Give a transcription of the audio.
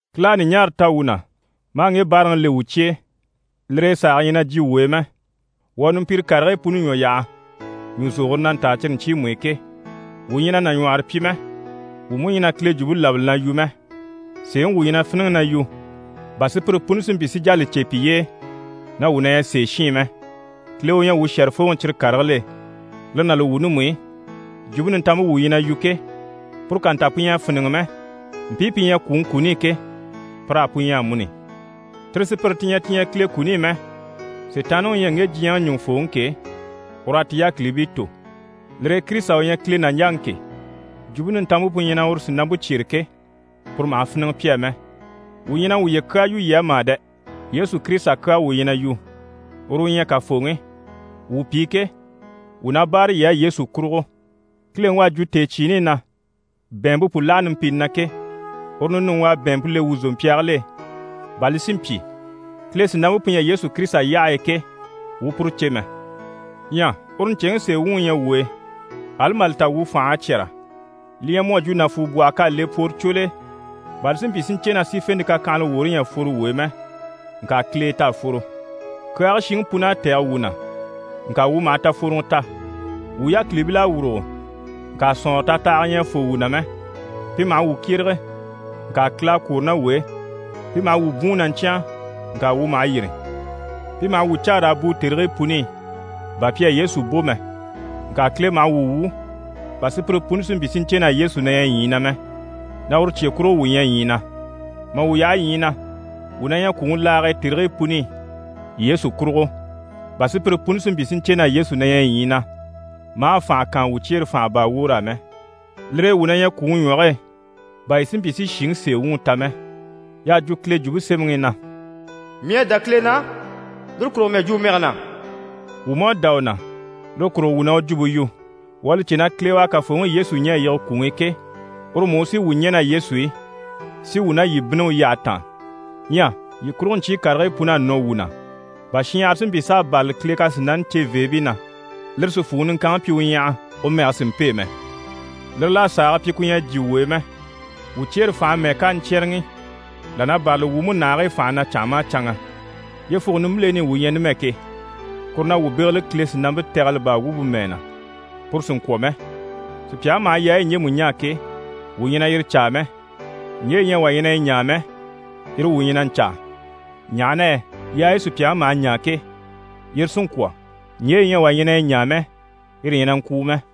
Kile à ɲùɲaara ta wuu na, maa ŋge báaraŋi le wuu cye e. Lire e sàage ɲyɛ na jyè wuu e mɛ. Wuu à numpire karigii puni ɲwɔ yaha, ɲùzogore na ntaa cyire ɲcyiimu i ke. Wuu ɲyɛ na nàɲwɔhɔrɔ pyi mɛ, wuu mú ɲyɛ na Kile Jwumpe labali na yu mɛ, sèeŋi wuu ɲyɛ na fíniŋi na yu, bà sùpyire puni si mpyi si jà li cè piye e na wuu na ɲyɛ sèeshiin mɛ. Kile u ɲyɛ wuu shɛ̀rɛfooŋi cyire karigil'e. Lire ná li wuuni mú i, Jwumpe Nintanmpe wuu ɲyɛ na yu ke, puru ká nta pu ɲyɛ a fíniŋɛ mɛ, mpii pi ɲyɛ kwùŋi kuni i ke, pir'á pu ɲyɛ amuni. Tire sùpyire ti ɲyɛ ti ɲyɛ Kile kuni i mɛ, Sitaanniŋi u ɲyɛ ŋge diɲyɛŋi ɲùŋufooŋi ke, ur'à ti yákilibii tò. Lire e Kirisita u ɲyɛ Kile nàɲjaŋi ke, Jwumpe Nintanmpe pu ɲyɛ na uru sìnampe cyêre ke, puru maha fíniŋɛ pi á mɛ. Wuu ɲyɛ na wuye kyaa yu yii á mà dɛ! Yesu Kirisita kyaa wuu ɲyɛ na yu, uru u ɲyɛ Kafooŋi. Wuu pi ke, wuu na báare yii á Yesu kurugo. Kileŋi u à jwo tèecyiini i na: «Bɛ̀ɛnmpe pu láha numpini na» ke, uru ninuŋi u à bɛ̀ɛnmpe le wuu zòmpyaagil'e, bà li si mpyi, Kile sìnampe pu ɲyɛ Yesu Kirisita yyahe e ke, wuu u puru cè mɛ. Ɲyɛ uru ɲcèŋi sèe wuŋi ɲyɛ wuu e, ali mà li ta wuu fành'à cyɛ́rɛ. Li ɲyɛ mu à jwo nàfuubwɔhɔ k'à le pworocwol'e bà li si mpyi si ɲcè na sífente kakyanhala woore ɲyɛ a fworo wuu e mɛ, ŋka Kile e t'à fworo. Kyaage shiŋi pun'à tɛ̀gɛ wuu na, ŋka wuu maha tafworoŋɔ ta. Wuu yákilibil'à wùrugo, ŋka sɔ̀nŋɔrɔ tatahaga ɲyɛ a fô wuu na mɛ. Pi maha wuu kyérege, ŋka Kile à kwôro ná wuu e. Pi maha wuu bwùun na ɲcyáan, ŋka wuu maha yîri. Pi maha wuu caa raa bùu tèrigii puni i bà pi à Yesu bò mɛ, ŋka Kile maha wuu wwû bà sùpyire puni si mpyi si ɲcè na Yesu na ɲyɛ ɲyii na mɛ, na uru cye kurugo wuu ɲyɛ ɲyii na. Mà wuu yaha ɲyii na, wuu na ɲyɛ kwùŋi laage e tèrigii puni i Yesu kurugo bà sùpyire puni si mpyi si ɲcè na Yesu na ɲyɛ ɲyii na, maa fànhe kaan wuu cyeere fànha baa woor'á mɛ. Lire e wuu na ɲyɛ kwùŋi ɲwɔge e bà yii si mpyi si shìŋi sèe wuŋi ta mɛ. Y'à jwo Kile Jwumpe Semɛŋi i na: «Mii à dá Kile na, lire kurugo mii à jwo u mɛge na.» Wuu mú à dá u na, lire kurugo, wuu na u jwumpe yu. Wuu à li cè na Kile u à Kafooŋi Yesu ɲɛ̀ a yige kwùŋi i ke, uru mú u sí wuu ɲɛ̀ ná Yesu i, si wuu ná yii bínni u yyahe taan. Ɲyɛ yii kurugo ɲcyii karigii pun'à nɔ wuu na, bà shinɲyahara si mpyi s'a bârali Kile kasinani ceveebii na, lire si fwùŋi niŋkanŋi pyi u ɲyaha, u mɛge si mpêe mɛ. Lire l'à sàage pyi ku ɲyɛ a jyè wuu e mɛ. Wuu cyeere fànhe mɛ́ɛ ká a ɲcyɛ́rɛŋi, là na bârali wuu múnahigii fànhe na canŋa maha canŋa. Yyefuge nimbileni i wuu ɲyɛ numɛ ke, kuru na wuu bégeli Kile sìnampe tɛgɛlɛ baa wumpe mɛɛ na, puru sì n‑kwɔ̀ mɛ. Sùpyaŋi maha yaayi ɲjemu ɲaa ke, wuu ɲyɛ na yire caa mɛ. Ɲje yi ɲyɛ wà ɲyɛ na yi ɲaa mɛ, yire wuu ɲyɛ na ɲcaa, ɲaha na yɛ yaayi sùpyaŋi maha ɲaa ke, yire sí n‑kwɔ̀; ɲje yi ɲyɛ wà ɲyɛ na yi ɲaa mɛ, yire ɲyɛ na ŋkwùu mɛ.